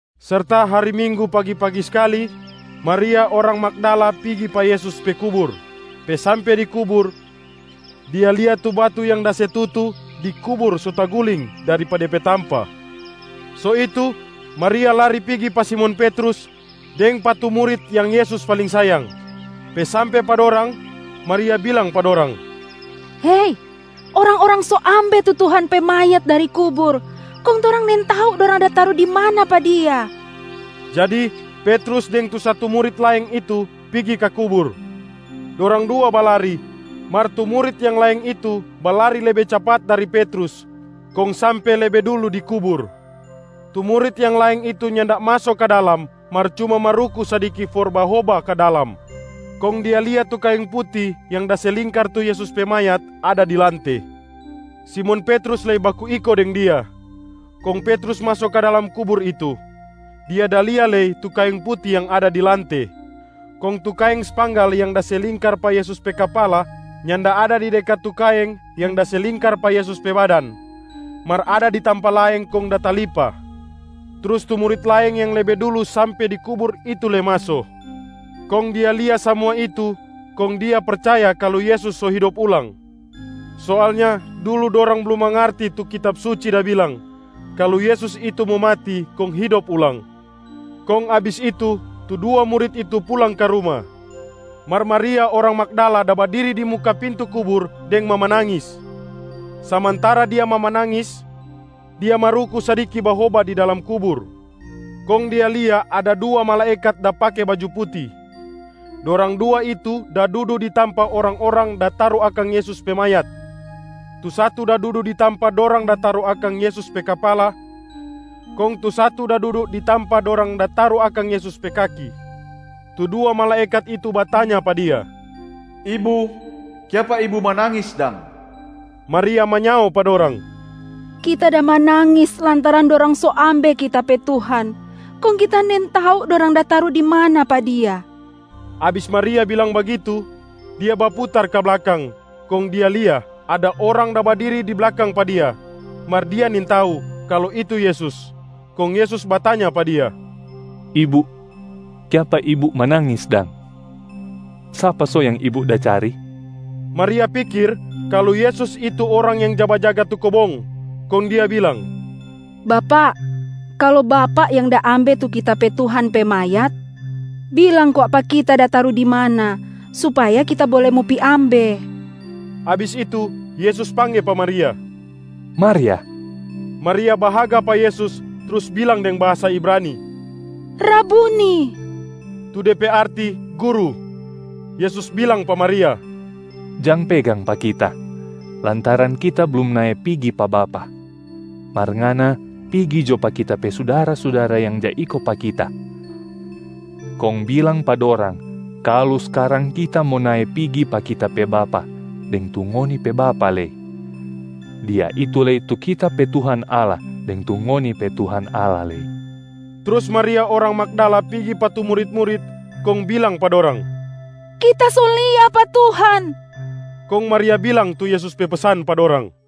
Serta hari minggu pagi-pagi skali, Maria orang Magdala pigi pa Yesus pe kubur. Pe sampe di kubur, dia lia tu batu yang da se tutu di kubur so taguling dari pa de pe tampa. So itu, Maria lari pigi pa Simon Petrus deng pa tu murit yang Yesus paling sayang. Pe sampe pa dorang, Maria bilang pa dorang, “Hei! Orang-orang so ambe tu Tuhan pe mayat dari kubur, kong torang nintau dorang da taru di mana pa Dia.” Jadi Petrus deng tu satu murit laeng itu pigi ka kubur. Dorang dua balari, mar tu murit yang laeng itu balari lebe capat dari Petrus kong sampe lebe dulu di kubur. Tu murit yang laeng itu nyanda maso ka dalam mar cuma maruku sadiki for bahoba ka dalam, kong dia lia tu kaeng puti yang da se lingkar tu Yesus pe mayat ada di lante. Simon Petrus lei baku iko deng dia, kong Petrus maso ka dalam kubur itu. Dia da lia lei tu kaeng puti yang ada di lante. Kong tu kaeng spanggal yang da se lingkar pa Yesus pe kapala nyanda ada di dekat tu kaeng yang da se lingkar pa Yesus pe badan, mar ada di tampa laeng kong da talipa. Trus tu murit laeng yang lebe dulu sampe di kubur itu lei maso, kong dia lia samua itu kong dia percaya kalu Yesus so hidop ulang. Soalnya, dulu dorang blum mangarti tu Kitab Suci da bilang, kalu Yesus itu mo mati kong hidop ulang. Kong abis itu, tu dua murit itu pulang ka ruma. Mar Maria orang Magdala da badiri di muka pintu kubur deng mamanangis. Samantara dia mamanangis, dia maruku sadiki bahoba di dalam kubur. Kong dia lia ada dua malaekat da pake baju puti. Dorang dua itu da dudu di tampa orang-orang da taru akang Yesus pe mayat. Tu satu da dudu di tampa dorang da taru akang Yesus pe kapala, kong tu satu da dudu di tampa dorang da taru akang Yesus pe kaki. Tu dua malaekat itu batanya pa dia, “Ibu, kiapa ibu manangis dang?” Maria manyao pa dorang, “Kita da manangis lantaran dorang so ambe kita pe Tuhan kong kita nintau dorang da taru di mana pa Dia.” Abis Maria bilang bagitu, dia baputar ka blakang kong dia lia ada orang da badiri di blakang pa dia, mar dia nintau kalu itu Yesus. Kong Yesus batanya pa dia, “Ibu, kiapa ibu manangis dang? Sapa so yang ibu da cari?” Maria pikir kalu Yesus itu orang yang ja bajaga tu kobong, kong dia bilang, “Bapak, kalu bapak yang da ambe tu kita pe Tuhan pe mayat, bilang kwa pa kita da taru di mana, supaya kita bole mo pi ambe.” Abis itu, Yesus pangge pa Maria, “Maria!” Maria bahaga pa Yesus trus bilang deng bahasa Ibrani, “Rabuni” tu de pe arti ‘guru’. Yesus bilang pa Maria, “Jang pegang pa Kita, lantaran Kita blum nae pigi pa Bapa. Mar ngana pigi jo pa Kita pe sudara-sudara yang ja iko pa Kita kong bilang pa dorang kalu skarang Kita mo nae pigi pa Kita pe Bapa deng tu ngoni pe Bapa lei. Dia itu lei tu Kita pe Tuhan Allah deng tu ngoni pe Tuhan Allah lei.” Trus Maria orang Magdala pigi pa tu murit-murit kong bilang pa dorang, “Kita so lia pa Tuhan!” Kong Maria bilang tu Yesus pe pesan pa dorang.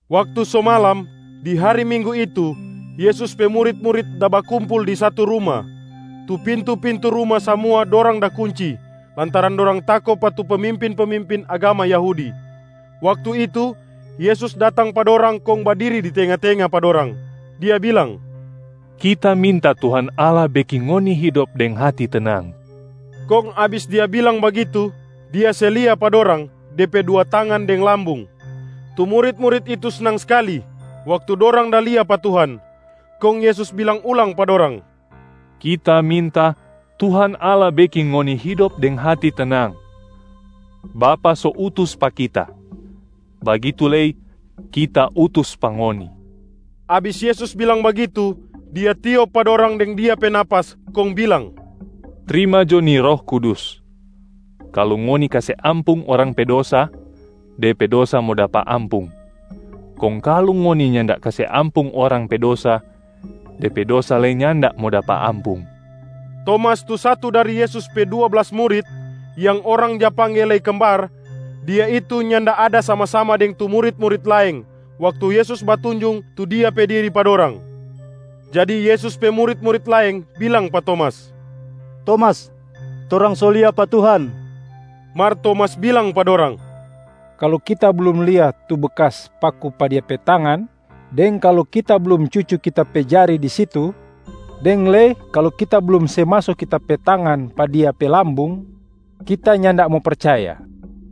Waktu so malam di hari minggu itu, Yesus pe murit-murit da bakumpul di satu ruma. Tu pintu-pintu ruma samua dorang da kunci lantaran dorang tako pa tu pemimpin-pemimpin agama Yahudi. Waktu itu, Yesus datang pa dorang kong badiri di tenga-tenga pa dorang, Dia bilang, “Kita minta Tuhan Allah beking ngoni hidop deng hati tenang!” Kong abis Dia bilang bagitu, Dia se lia pa dorang De pe dua tangan deng lambung. Tu murit-murit itu snang skali waktu dorang da lia pa Tuhan. Kong Yesus bilang ulang pa dorang, “Kita minta Tuhan Allah beking ngoni hidop deng hati tenang! Bapa so utus pa Kita, bagitu lei Kita utus pa ngoni.” Abis Yesus bilang bagitu, Dia tiop pa dorang deng Dia pe nafas kong bilang, “Trima jo ni Roh Kudus. Kalu ngoni kase ampung orang pe dosa, de pe dosa mo dapa ampung, kong kalu ngoni nyanda kase ampung orang pe dosa, de pe dosa lei nyanda mo dapa ampung.” Tomas tu satu dari Yesus pe dua blas murit, yang orang ja pangge lei Kembar, dia itu nyanda ada sama-sama deng tu murit-murit laeng waktu Yesus batunjung tu Dia pe diri pa dorang. Jadi Yesus pe murit-murit laeng bilang pa Tomas, “Tomas, torang so lia pa Tuhan!” Mar Tomas bilang pa dorang, “Kalu kita blum lia tu bekas paku pa Dia pe tangan, deng kalu kita blum cucu kita pe jare di situ, deng lei kalu kita blum se maso kita pe tangan pa Dia pe lambung, kita nyanda mo percaya.”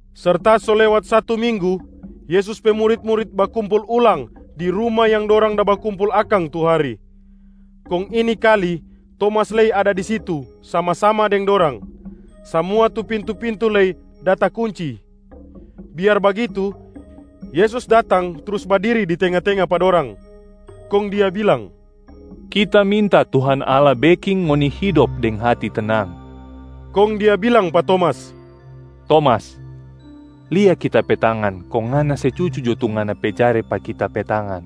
Serta so lewat satu minggu, Yesus pe murit-murit bakumpul ulang di ruma yang dorang da bakumpul akang tu hari. Kong ini kali, Tomas lei ada di situ sama-sama deng dorang. Samua tu pintu-pintu lei da takunci. Biar bagitu, Yesus datang trus badiri di tenga-tenga pa dorang, kong Dia bilang, “Kita minta Tuhan Allah beking ngoni hidop deng hati tenang.” Kong Dia bilang pa Tomas, “Tomas, lia Kita pe tangan kong ngana se cucu jo tu ngana pe jare pa Kita pe tangan,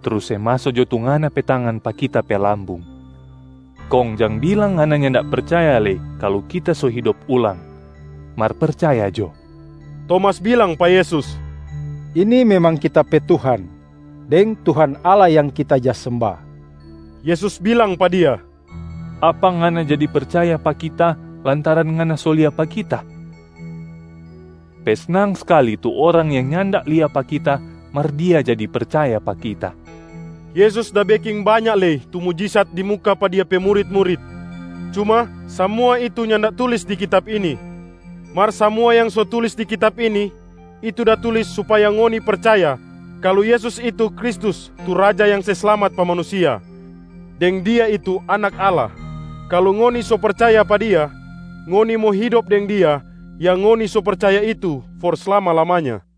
trus se maso jo tu ngana pe tangan pa Kita pe lambung. Kong, jang bilang ngana nyanda percaya lei kalu Kita so hidop ulang, mar percaya jo.” Tomas bilang pa Yesus, “Ini memang kita pe Tuhan deng Tuhan Allah yang kita ja semba.” Yesus bilang pa dia, “Apa ngana jadi percaya pa Kita lantaran ngana so lia pa Kita? Pe snang skali tu orang yang nyanda lia pa Kita mar dia jadi percaya pa Kita.” Yesus da beking banya lei mujisat di muka pa Dia pe murit-murit, cuma samua itu nyanda tulis di kitab ini. Mar samua yang so tulis di kitab ini, itu da tulis supaya ngoni percaya kalu Yesus itu Kristus tu Raja yang se slamat pa manusia deng Dia itu Anak Allah. Kalu ngoni so percaya pa Dia, ngoni mo hidop deng Dia yang ngoni so percaya itu for slama-lamanya.